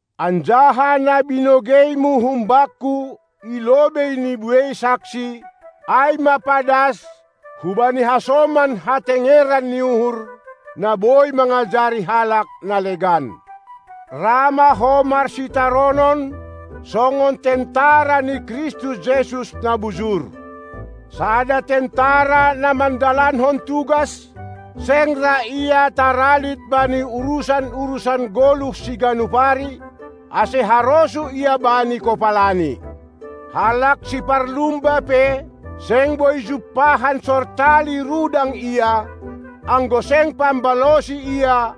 anjaha na binogeimu humbakku i lobei ni buei saksi, ai ma padas hubani hasoman hatengeran ni uhur, na boi mangajari halak na legan. Ra ma ho marsitaronon, songon tentara ni Kristus Jesus na bujur. Sada tentara na mandalankon tugas, seng ra ia taralit bani urusan-urusan goluh siganup ari, ase harosuh ia bani kopalani. Halak siparlumba pe, seng boi jumpahan sortali rudang ia, anggo seng pambalosi ia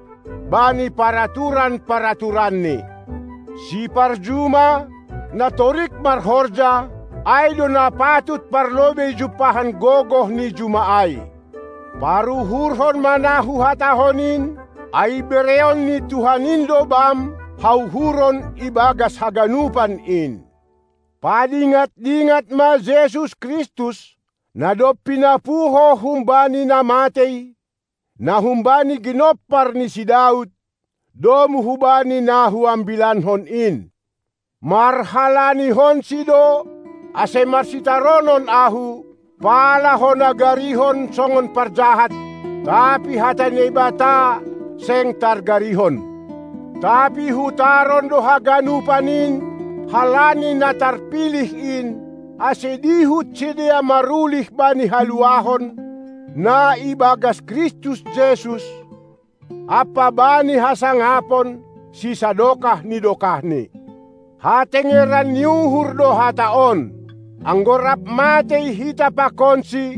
bani paraturan-paraturanni. Siparjuma, na torik marhorja, ai do na patut parlobei jumpahan gogoh ni juma ai. Paruhurhon ma na huhatahon in, ai bereon ni Tuhan in do bam hauhuron ibagas haganupan in. Padingat-dingat ma Jesus Kristus, na dob pinapuho humbani na matei, na humbani ginompar ni si Daud, domu hubani na huambilankon in. MarhalanihonSi do ase marsitaronon ahu, pala hona garihon songon parjahat; tapi hata ni Naibata, seng targarihon. Tapi hutaron do haganupan in halani na tarpilih in, ase dihut sidea marulih bani haluahon, na ibagas Kristus Jesus ampa bani hasangapon sisadokah ni dokahni. Hatengeran ni uhur do hata on: Anggo rap matei hita pakonSi,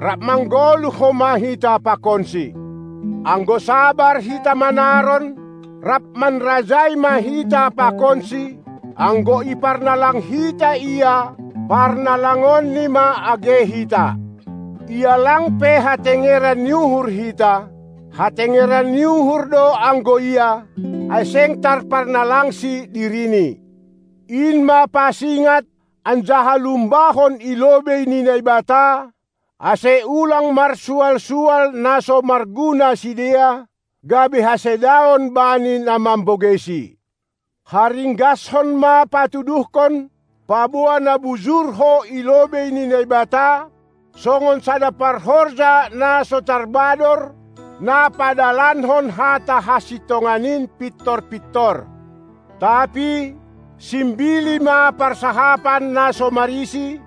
rap manggoluh ma homa hita pakonSi. Anggo sabar hita manaron, rap manrajai ma hita pakonSi; anggo iparnalang hita Ia, parnalangonNi ma age hita. Ia lang pe hatengeran ni uhur hita hatengeran ni uhur do anggo Ia, ai seng tarparnalangSi diriNi. In ma pasingat anjaha lumbahon i lobei ni Naibata, ase ulang marsual-sual na so marguna sidea, gabe hasedaon bani na mambogeisi. Haringgashon ma patuduhkon, paboa na bujur ho i lobei ni Naibata, songon sada parhorja na so tarbador, na padalankon hata hasintongan in pintor-pintor. Tapi simbili ma parsahapan na so marisi,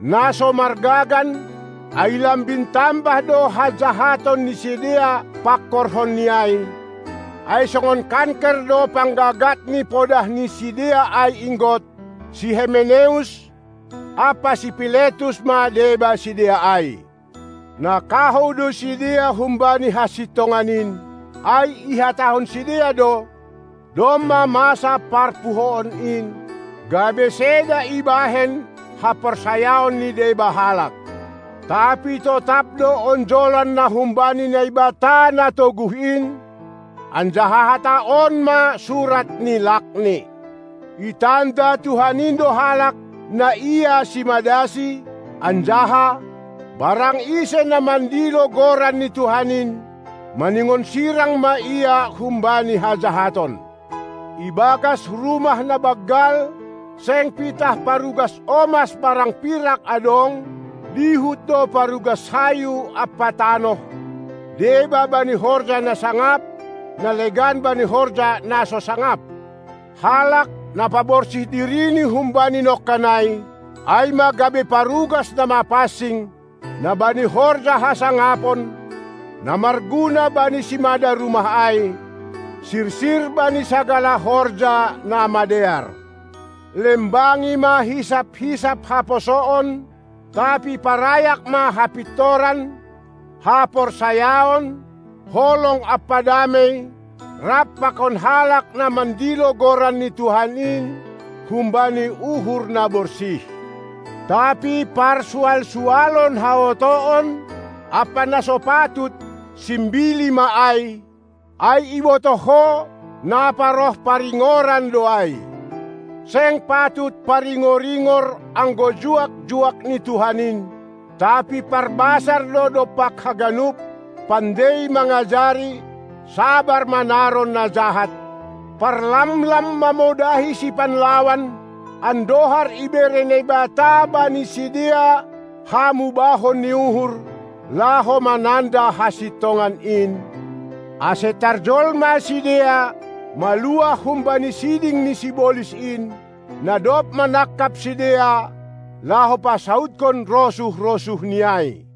na so margagan, ai lambin tambah do hajahaton ni sidea pangkorhonni ai, ai songon kanker do panggagat ni podah ni sidea ai inggot, si Hemeneus ampa si Piletus ma deba sidea ai. Na kahou do sidea humbani hasintongan in, ai ihatahon sidea do: "Domma masa parpuhoon in," gabe seda ibahen haporsayaon ni deba halak. Tapi totap do onjolan na humbani Naibata na toguh in, anjaha hata on ma surat ni lakni: "Itanda Tuhan in do halak, na Ia simadasi; anjaha: Barang ise na mandilo goran ni Tuhan in, maningon sirang ma ia humbani hajahaton". Ibagas rumah na banggal, seng pitah parugas omas barang pirak adong, dihut do parugas hayu ampa tanoh, deba bani horja na sangap, na legan bani horja na so sangap. Halak, na paborsih dirini humbani nongkan ai, ai ma gabe parugas na mapansing, na bani horja hasangapon, na marguna bani simada rumah ai, sirsir bani sagala horja na madear. Lembangi ma hisap-hisap haposoon, tapi parayak ma hapintoran, haporsayaon, holong ampa damei, rap pakon halak, na mandilo goran ni Tuhan in humbani uhur na borsih. Tapi parsual-sualon haotoon ampa na so patut, simbili ma ai, ai ibotoh ho, na paroh paringoran do ai. Seng patut paringor-ingor anggo juak-juak ni Tuhan in, tapi parbasar do dompak haganup, pandei mangajari, sabar manaron na jahat, parlamlam mamodahi sipanlawan, andohar ibere Naibata bani sidea hamubahon ni uhur, laho mananda hasintongan in, ase tarjolma sidea, maluah humbani siding ni sibolis in, na dob manangkap sidea, laho pasaudhon rosuh-rosuhni ai.